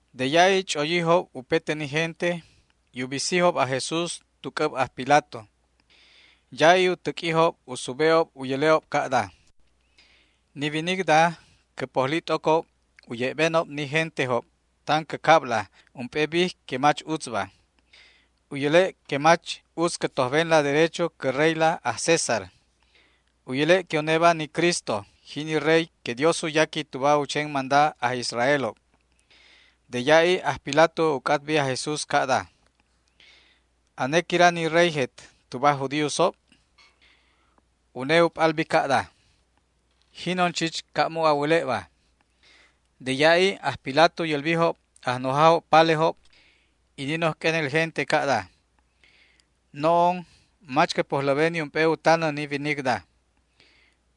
De ya'i ch'oyijob upete ni gente y u bisijob aj Jesús tu c'äb aj Pilato. Ya'i u täq'uijob u sube'ob u yäle'ob ca'da: ―Ni winicda cä pojli t'ocob u ye'benob ni gentejob tan cä cabla ump'e bij que mach utzba. U yäle' que mach utz cä tojbenla derecho cä reyla aj César. U yäle' que uneba ni Cristo, jini rey que Dios u yaqui tuba u chen manda aj Israelob. De ya'i aj Pilato u c'atbi aj Jesús ca'da: ―¿Ane quira ni reyjet tuba aj judíosob? Une u p'albi ca'da: ―Jinon chich ca' mu' a wäle'ba. De ya'i aj Pilato u yälbijob ajnojajob palejob y ni noj q'uenel gente ca'da: ―No'on mach cä pojläbe niump'e u tanä ni winicda.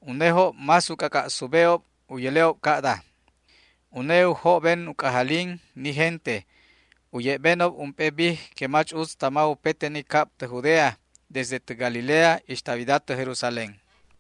Unejob más u c'ac'a' sube'ob u yäle'ob ca'da: ―Une u jobben u c'ajalinob ni gente. U ye'benob ump'e bij que mach utz tama upete ni cab tä Judea desde tä Galilea ixta wida tä Jerusalén.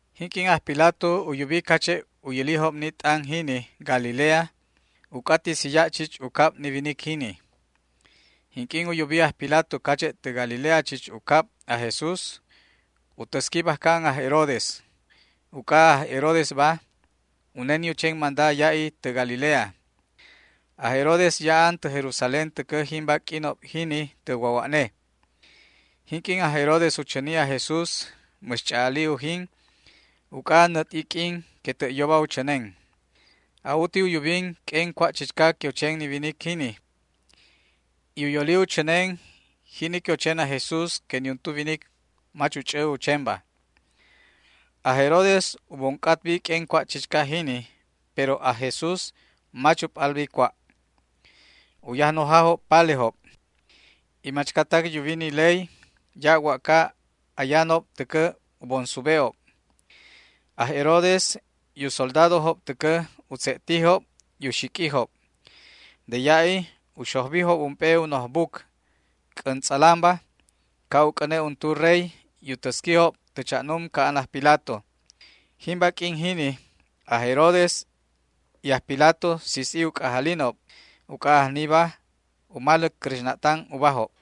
Jinq'uin aj Pilato u yubi cache' u yälijob ni t'an jini, Galilea, u c'ati si ya' chich u cab ni winic jini. Jinq'uin u yubi aj Pilato cache' tä Galilea chich u cab aj Jesús, u täsqui bajca an aj Herodes, uc'a aj Herodesba, une ni u chen manda ya'i tä Galilea. Aj Herodes ya'an tä Jerusalén täcä jimba q'uinob jini tä wawa'ne. Jinq'uin aj Herodes u chäni aj Jesús mäx ch'a'ali ujin, uc'a anät'i q'uin que tä' yoba u chänen. A'uti u yubin q'uen cua' chichca que u chen ni winic jini y u yoli u chänen jini que u chen aj Jesús que niuntu winic mach u ch'ä u chenba. Aj Herodes u bon c'atbi q'uen cua' chichca jini, pero aj Jesús mach u p'albi cua'. U yajnojajob palejob y machcatac yuwi ni ley ya' wa'ca ayanob täcä u bon sube'ob. Aj Herodes y u soldadojob täcä u tze'tijob y u xiq'uijob. De ya'i u xojbijob ump'e u noj buc c'äntz'alanba ca' u c'äne' untu rey y u täsquijob tä cha'num ca'an aj Pilato. Jimba q'uin jini aj Herodes y aj Pilato sis'i u c'ajalinob, uc'a ajniba u maläc cräxna'tan ubajob.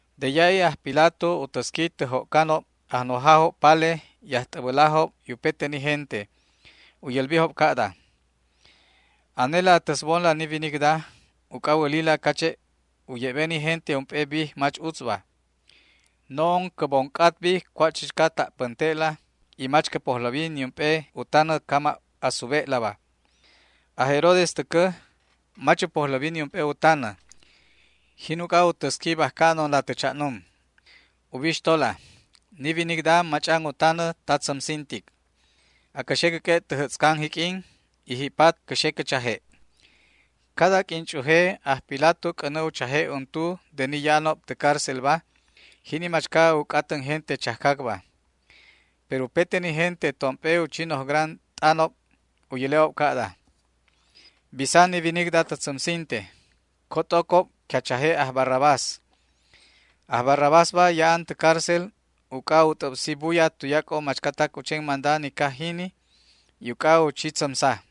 De ya'i aj Pilato u täsqui tä jo'canob ajnojajob pale y ajt'äbälajob y upete ni gente. U yälbijob ca'da: ―Anela a täsbonla ni winicda uc'a a wälila cache' u ye'ben ni gente ump'e bij mach utzba. No'on cä bon c'atbi cua' chichca ta' pänte'la y mach cä pojläbi niump'e u tanä cama' a sube'laba. Aj Herodes täcä mach u pojläbi niump'e u tanä. Jin uc'a u täsqui bajca anonla tä cha'num. Ubixtola, ni winicda mach'an u tanä ta tzämsintic. Acä xe cäq'ue' tä jätz'can jiq'uin, y ji'pat cä xe cä chaje'. Cada q'uin ch'uje aj Pilato c'änä u chaje' untu de ni ya'anob tä cárcelba, jini machca u c'atän gente chajcacba. Pero upete ni gente tomp'e u chi noj gran t'anob u yäle'ob ca'da: ―¡Bisan ni winicda tä tzämsinte! ¡Co t'ocob que a chaje' aj Barrabás! Aj Barrabásba ya'an tä cárcel uc'a u t'äbsi buya tuyac'o machcatac u chen manda ni caj jini y uc'a u chi tzämsa.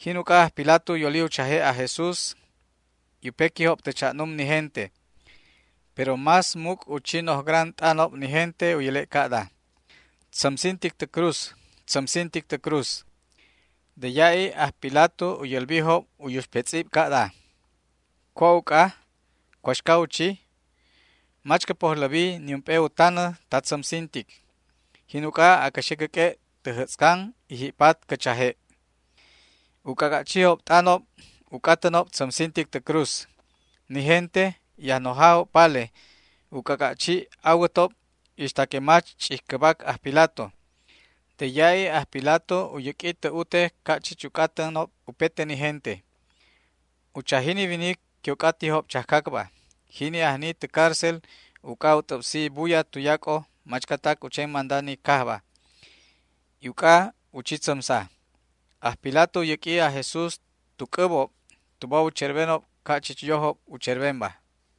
Jin uc'a aj Pilato u yoli u chaje' aj Jesús, y u pequijob tä cha'num ni gente. Pero más muc' u chi noj gran t'anob ni gente u yäle' ca'da: ―¡Tzämsintic tä cruz! ¡Tzämsintic tä cruz! De ya'i aj Pilato u yälbijob u yuxpetz'ib ca'da: ―¿Cua' uc'a? ¿Cuaxca u chi? Mach cä pojläbi niump'e u tanä ta tzämsintic. Jin uc'a acä xe cäq'ue' tä jätz'can y ji'pat cä chaje'. U c'ac'a' chijob t'anob u c'atänob tzämsintic tä cruz. Ni gente y ajnojajob pale u c'ac'a' chi awätob ixta que mach ch'ijcäbac aj Pilato. De ya'i aj Pilato u yäq'ui tä ute ca' chich u c'atänob upete ni gente. U chaji ni winic que u c'atijob chajcacba, jini ajni tä cárcel uc'a u t'äbsi buya tuyac'o machcatac u chen manda ni cajba, y uc'a u chi tzämsaba. Aj Pilato u yäq'ui aj Jesús tu c'äbob tuba u cherbenob ca' chich yojob u cherbenba.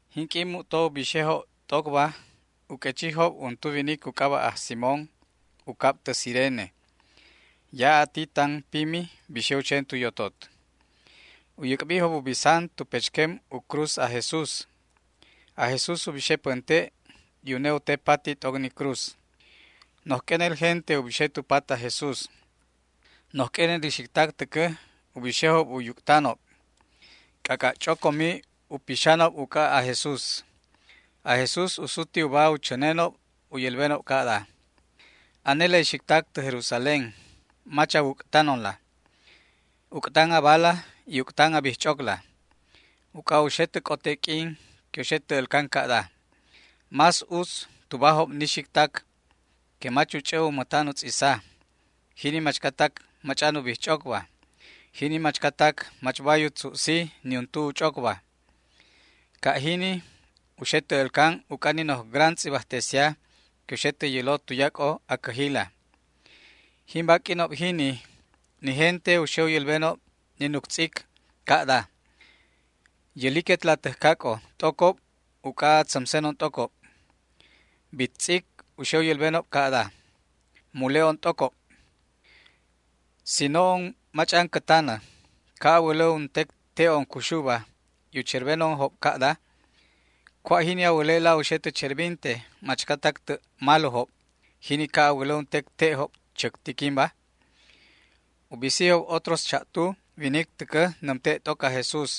Jinq'uin mu'to u bixejob t'ocba u q'uechijob untu winic u c'aba' aj Simón, u cab tä Cirene. Ya' ati tan pimi, bixe u chen tu yotot. U yäc'bijob u bisan tu pechquem u cruz aj Jesús. Aj Jesús u bixe pänte', y une u te pati t'oc ni cruz. Noj q'uenel gente u bixe tu pat aj Jesús. Noj q'uenel ixictac täcä u bixejob u yuc'tanob. C'ac'a' ch'ocomi u pixanob uc'a aj Jesús. Aj Jesús u suti uba u chänenob u yälbenob ca'da: ―Anela ixictac tä Jerusalén, mach a wuc'tanonla, uc'tan abala y uc'tan a bijch'ocla. Uc'a u xe tä c'ote q'uin que u xe tä älcan ca'da: “Más utz tubajob ni ixictac que mach u ch'ä u mätan u tz'isa, jini machcatac mach'an u bijch'ocba, jini machcatac mach bay u tzu'si niuntu u ch'ocba”. Ca' jini u xe tä älcan uc'a ni noj gran tz'ibajtesia que u xe tä yälo tuyac'o a cäjila. Jimba q'uinob jini gente u xe u yälbenob ni nuc tz'icjob ca'da: “Yäliquetla täjcac'o t'ocob uc'a a tzämsenon t'ocob”. Bit tz'icob u xe u yälbenob ca'da: “Mule'on t'ocob”. Si no'on mach'an cä tanä, ca' a wälä untec te'on cuxuba, y u cherbenonjob ca'da, ¿cua' jini a wäle'la u xe tä cherbinte machcatac tä' malojobba, jini ca' a wälä untec te'job chäc tiquinba? U bisijob otros cha'tu winic täcä nämte' t'oc aj Jesús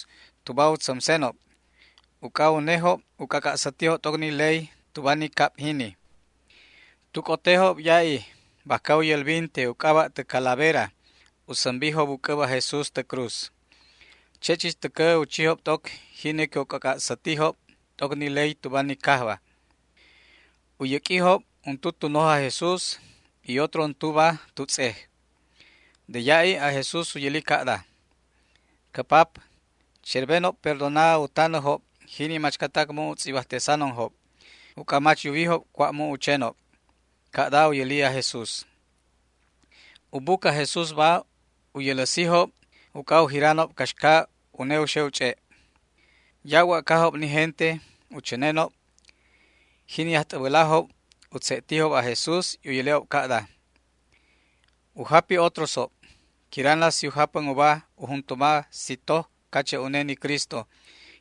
tuba u tzämsenob, uc'a unejob u c'ac'a' sätijob t'oc ni ley tuba ni cab jini. Tu c'otejob ya'i bajca u yälbinte u c'aba' tä Calavera u sämbijob u c'äb aj Jesús tä cruz. Che' chich täcä u chijob t'oc jini que u c'ac'a' sätijob t'oc ni ley tuba ni cajba. U yäq'uijob untu tu noj aj Jesús y otro untuba tu tz'ej. De ya'i aj Jesús u yäli ca'da: ―Cä Pap, cherbenob perdona u tanäjob jini machcatac mu' u tz'ibajtesanonjobba, uc'a mach yuwijob cua' mu' u chenob ―ca'da u yäli aj Jesús. U bucla aj Jesúsba u yäläsijob uc'a u jiranob caxcatac une u xe u ch'e'. Ya' wa'cajob ni gente u chänenob. Jini ajt'äbälajob u tze'tijob aj Jesús u yäle'ob ca'da: ―U japi otrosjob. Quiranla si u japän uba u juntuma si toj cache' une ni Cristo,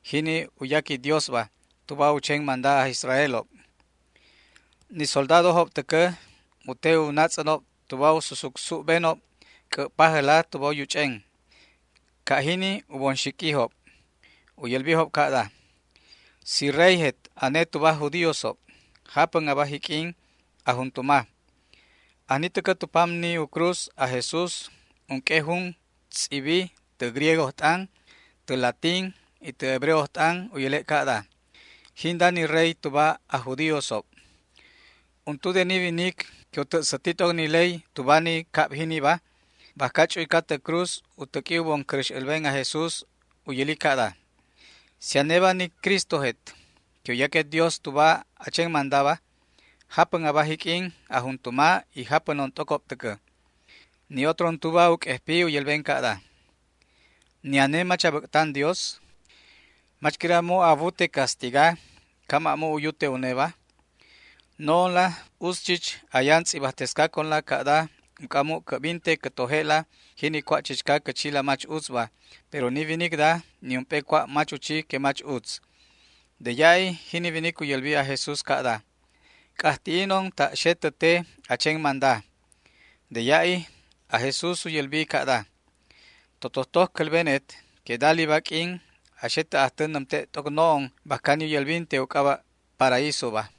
jini u yaqui Diosba tuba u chen manda aj Israelob. Ni soldadojob täcä u te u natz'änob tuba u susuc subbenob c'äb pajäla tuba u yuch'en. Ca' jini u bon xiq'uijob. U yälbijob ca'da: ―Si reyjet ane tuba aj judíosob, japän aba jiq'uin a juntuma. Ajni täcä tu pam ni u cruz aj Jesús unq'ue jun tz'ibi tä griegojt'an, tä latin y tä hebreojt'an u yäle' ca'da: “Jinda ni Rey tuba aj judíosob”. Untu de ni winic que u tä' säti t'oc ni ley tuba ni cab jiniba, bajca ch'uyca tä cruz u täq'ui u bon cäräx älben aj Jesús. U yäli ca'da: ―Si aneba ni Cristojet que u yaquet Dios tuba a chen mandaba, japän aba jiq'uin a juntuma y japänon t'ocob täcä. Ni otro untuba u q'uejpi u yälben ca'da: ―¿Ni ane mach a bäc'tan Dios? ¿Mach quira mu' a wute castiga cama' mu' u yute uneba? No'onla utz chich ayan tz'ibajtescaconla ca'da uc'a mu' cä'binte cä toje'la jini cua' chichca cä chila mach utzba, pero ni winicda niump'e cua' mach u chi que mach utzba. De ya'i jini winic u yälbi aj Jesús ca'da: ―C'ajti'inon ta' xe tä te a chen mandaba. De ya'i aj Jesús u yälbi ca'da: ―Totojtoj cälbenet que daliba q'uin a xe tä ajtä nämte' t'oc no'on bajca ni u yälbinte u c'aba' tä paraísoba.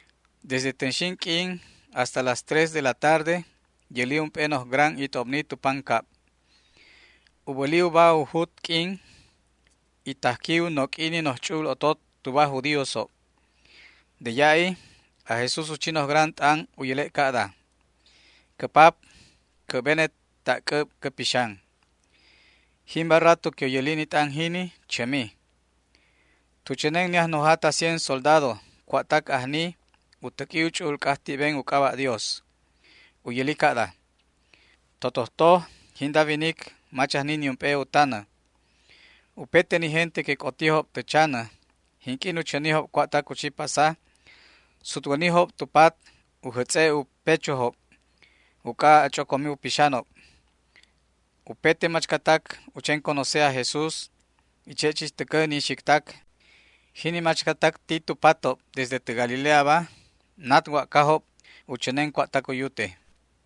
Desde tänxin q'uin hasta las tres de la tarde yäli ump'e noj gran it'obni tu pancab. U bäli uba u jut q'uin y tajqui u noq'ui ni noj ch'u'ul otot tuba aj judíosob. De ya'i aj Jesús u chi noj gran t'an u yäle' ca'da: ―Cä Pap, cä'benet ta' c'äb cä pixan. Jimba rato que u yäli ni t'an jini, chämi. Tu chänen ni ajnoja ta cien soldadoba cua'tac ajni u täq'ui u ch'u'ul c'ajti'ben u c'aba' Dios. U yäli ca'da: ―Totojtoj jinda winic mach ajni niump'e u tanä. Upete ni gente que c'otijob tä chanä, jinq'uin u chänijob cua'tac u chi pasa, sutwänijob tu pat u jätz'e' u pechojob uc'a ach'ocomi u pixanob. Upete machcatac u chen conoce aj Jesús, y che' chich täcä ni ixictac, jini machcatac ti tu patob desde tä Galileaba, nat wa'cajob u chänen cua'tac u yute.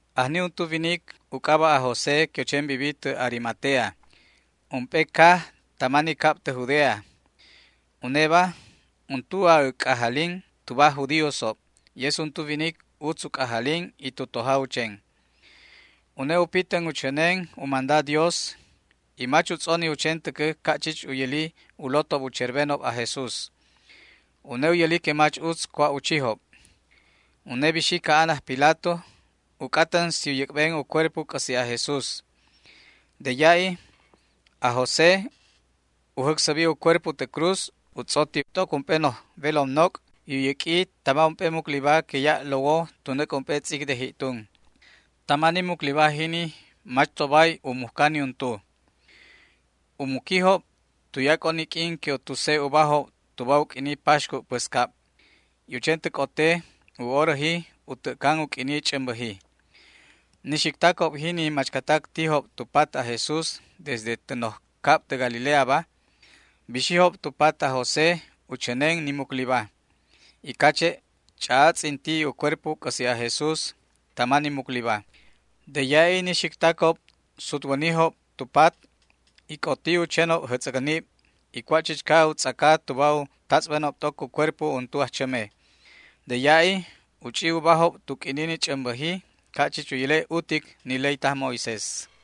Ajni untu winic u c'aba' aj José que u chen vivi tä Arimatea, ump'e caj tama ni noj cab tä Judea. Uneba untu a'äc'c'ajalinob tuba aj judíosob y es untu winic utz u c'ajalin y tu toja u chen. Une u pitän u chänen u manda Dios, y mach u tz'oni u chen täcä ca' chich u yäli u lotob u cherbenob aj Jesús. Une u yäli que mach utz cua' u chijob. Une bixi ca'an aj Pilato u c'atän si u yäc'ben u cuerpo c'äsi' aj Jesús. De ya'i aj José u jäcsäbi u cuerpo tä cruz, u tz'oti t'oc ump'e noj welom noc' y u yäq'ui tama ump'e mucliba que ya' lowo tu näc' ump'e tz'ic de ji'tun. Tama ni mucliba jini mach to bay umujca niuntu. U muquijob tuyac'o ni q'uin que u tuse' ubajob tuba u q'uini paxcu' päscab, y u chen tä c'ote u horäji u tä'can u q'uini ch'ämbäji. Ni ixictacob, jini machca tijob tu pat aj Jesús desde tä noj cab tä Galileaba, bixijob tu pat aj José u chänen ni mucliba, y cache' ch'a'atz'inti u cuerpo c'äsi' aj Jesús tama ni mucliba. De ya'i ni ixictacob sutwänijob tu pat, y c'otijob u chenob jätz'äcnib y cua' chichca u tz'aca tuba u tatz'benob t'oc u cuerpo untu ajchäme. De ya'i u ch'i ubajob tu q'uini ni ch'ämbäji ca' chich u yäle' utic ni ley taj Moisés.